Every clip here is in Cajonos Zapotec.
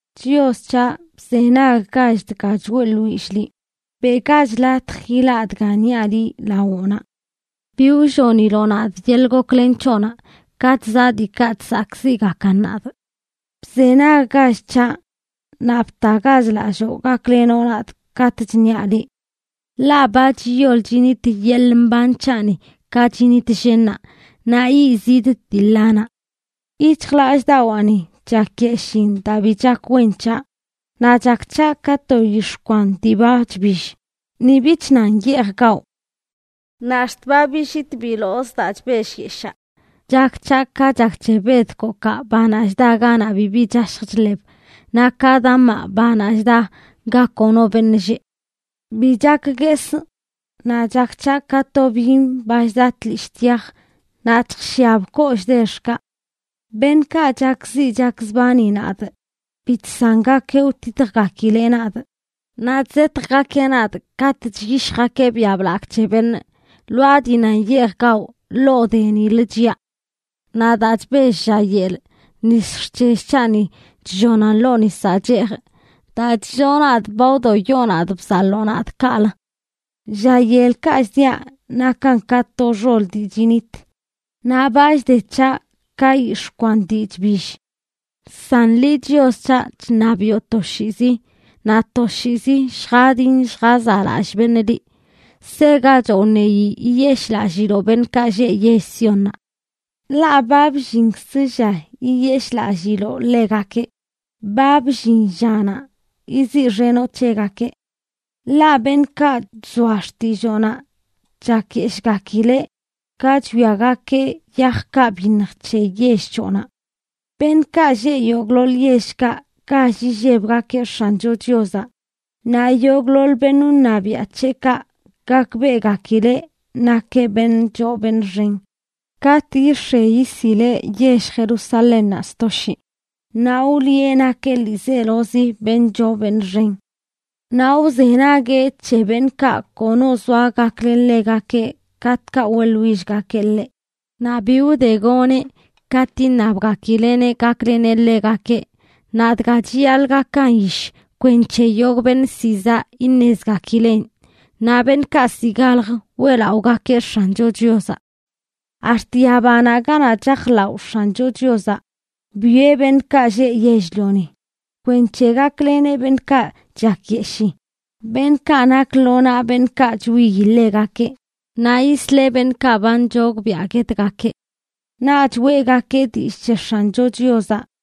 Chios c̱haꞌ, bzenaggach dga choeꞌḻwillꞌ liꞌ, beꞌgach latj ilaꞌ dga niaꞌ liꞌ lawoꞌnaꞌ. Bi wlloniloꞌ nadꞌ yeḻꞌ goklen c̱hoꞌnaꞌ katꞌ zaꞌ diikaꞌ chsakꞌziꞌgakan nadꞌ. Bzenaggach c̱haꞌ, naꞌ btagach lalloo gaklenoꞌ nadꞌ katꞌ chṉiaꞌ liꞌ. Ḻaꞌ ba chiyol chinit yeḻꞌ mban c̱haꞌni ka chinit llennaꞌ, naꞌ yiꞌzidꞌ dii ḻanaꞌ. Yic̱hjlallꞌdawaani chakyeshiin daa bi chak wen c̱haꞌ, naꞌ chak c̱haꞌ ka to yix̱ꞌ kwan dii ba chbill; ni bich nan yeej gawꞌ. Naꞌ ax̱t ba billit bilozꞌ daa chbellyeshaa. Chak c̱haꞌ ka chak c̱he bedkokaꞌ, banaꞌ chda ganaꞌ bibi chashj chḻeb, naꞌ ka damaꞌ, banaꞌ chda ga kono beṉꞌ lleꞌ. Bi chak guesꞌ. Naꞌ chak c̱haꞌ ka to byiṉ ba chda tlishꞌ tyaj naꞌ chjshiab kollꞌ dexkaꞌ. Beṉꞌkaꞌ chakziꞌ chakzbani nadꞌ bi chsangakeꞌ wtitjgakileꞌ nadꞌ, naꞌ chzetjgakeꞌ nadꞌ katꞌ chyishjgakeꞌ biaꞌ blagꞌ c̱he beṉꞌ. Lwaa dii nan yeej gawꞌ, ḻoo de nilə chiꞌa. Naꞌ daa chbellꞌ lla yel, nis xc̱hell c̱haꞌni chllonan ḻoo nisaꞌ cheejꞌ. Daa chlloo nadꞌ ba wdoyoꞌ nadꞌ bzaḻoo nadꞌ kaꞌlə. Lla yelkaꞌ chdiaꞌ nakan ka to xol dii chinit; naꞌ ba chde c̱haꞌ ka yix̱ꞌ kwan dii chbill. San liꞌ, Chios c̱haꞌ, chṉabiꞌo toshiizi; naꞌ toshiizi lljadin lljazaꞌlallꞌ beṉꞌ liꞌ. Segachoꞌ wṉeyi yiyeshꞌlalliloꞌ beṉꞌkaꞌ lleꞌ yell Siónnaꞌ, ḻaꞌ ba bllinkz lla yiyeshꞌlalliloꞌ ḻegakeꞌ; ba bllin llanaꞌ yiziꞌxenoꞌ c̱hegakeꞌ. Ḻaꞌ beṉꞌkaꞌ chzoa xtilloonaꞌ chakyeshꞌgakileꞌ ka chwiagakeꞌ yajkaꞌ byiṉj c̱he yell c̱hoꞌnaꞌ. Beṉꞌkaꞌ lleꞌ yogꞌḻoḻ yellkaꞌ gall illebgakeꞌ X̱ancho Chiozaꞌ, naꞌ yogꞌḻoḻ beṉꞌ wṉabiaꞌ c̱heꞌkaꞌ gakbeꞌgakileꞌ nakeꞌ beṉꞌ beṉꞌ choo beṉꞌ xen. Katꞌ yix̱e yisileꞌ yell Jerusalénnaꞌ sto shii, naꞌ wliꞌe nakeꞌ ḻiizelozi beṉꞌ choo beṉꞌ xen. Naꞌ wzenagueꞌ c̱he beṉꞌkaꞌ kono zoa gaklen ḻegakeꞌ katꞌkaꞌ weꞌḻwillgakeꞌ ḻeꞌ, naꞌ bi wdegoneꞌ katꞌ iṉabgakileꞌneꞌ gakleneꞌ ḻegakeꞌ. Naꞌ dga chiyaḻꞌ gakan yish kwenc̱he yogꞌ beṉꞌ ziꞌ zaꞌ iṉezgakileꞌn, naꞌ beṉꞌkaꞌ ziꞌ galj weꞌlaꞌogakeꞌ X̱ancho Chiozaꞌ. Ax̱t yabanaꞌ ganaꞌ chajlaꞌo X̱ancho Chiozaꞌ, bwieꞌ beṉꞌkaꞌ lleꞌ yell-lioni, kwenc̱he gakleneꞌ beṉꞌkaꞌ chakyeshii, beṉꞌkaꞌ nak lo naꞌ beṉꞌkaꞌ chwiyi ḻegakeꞌ, naꞌ yisleꞌ beṉꞌkaꞌ ba nchogbiaꞌ guetgakeꞌ. Naꞌch weꞌgakeꞌ dillꞌ c̱he X̱ancho Chiozaꞌ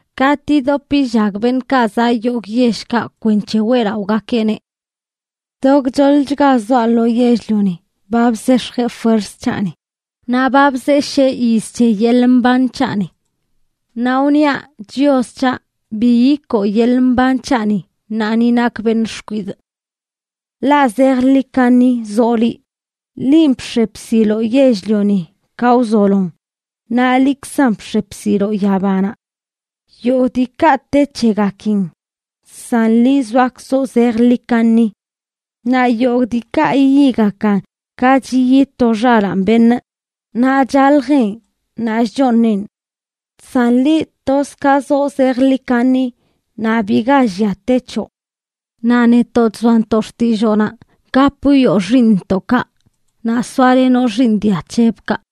katꞌ yidop yillag beṉꞌkaꞌ zaꞌ yogꞌ yellkaꞌ kwenc̱he weꞌlaꞌogakeꞌneꞌ. To gchoḻchga zoaꞌ lo yell-lioni ba bzex̱jeꞌ fuerz c̱haꞌni; naꞌ ba bzeshee yiz c̱he yeḻꞌ mban c̱haꞌni. Naꞌ wniaꞌ: “Chios c̱haꞌ, bi yikoo yeḻꞌ mban c̱haꞌni ṉaa ni nakꞌ beṉꞌ xkwidꞌ.” Ḻaꞌ zejḻi kaṉi zoꞌ liꞌ. Linꞌ bx̱e bsiloꞌ yell-lioni ka wzolon, naꞌ liꞌkzan bx̱e bsiloꞌ yabanaꞌ. Yogꞌ diikaꞌ te c̱hegakin, san liꞌ zoakzoꞌ zejḻi kaṉi. Naꞌ yogꞌ diikaꞌ yiyigakan ka chiyi to xalaan beṉꞌ, naꞌ chaljeꞌn naꞌ chchooṉeꞌn. San liꞌ, toz ka zoꞌ zejḻi kaṉi; naꞌ biga llia te c̱hoꞌ. Naꞌ netoꞌ chzoantoꞌ xtilloonaꞌ, gap wwioꞌ xiiṉntoꞌkaꞌ naꞌ soalenoꞌ xiiṉ dia c̱hebꞌkaꞌ.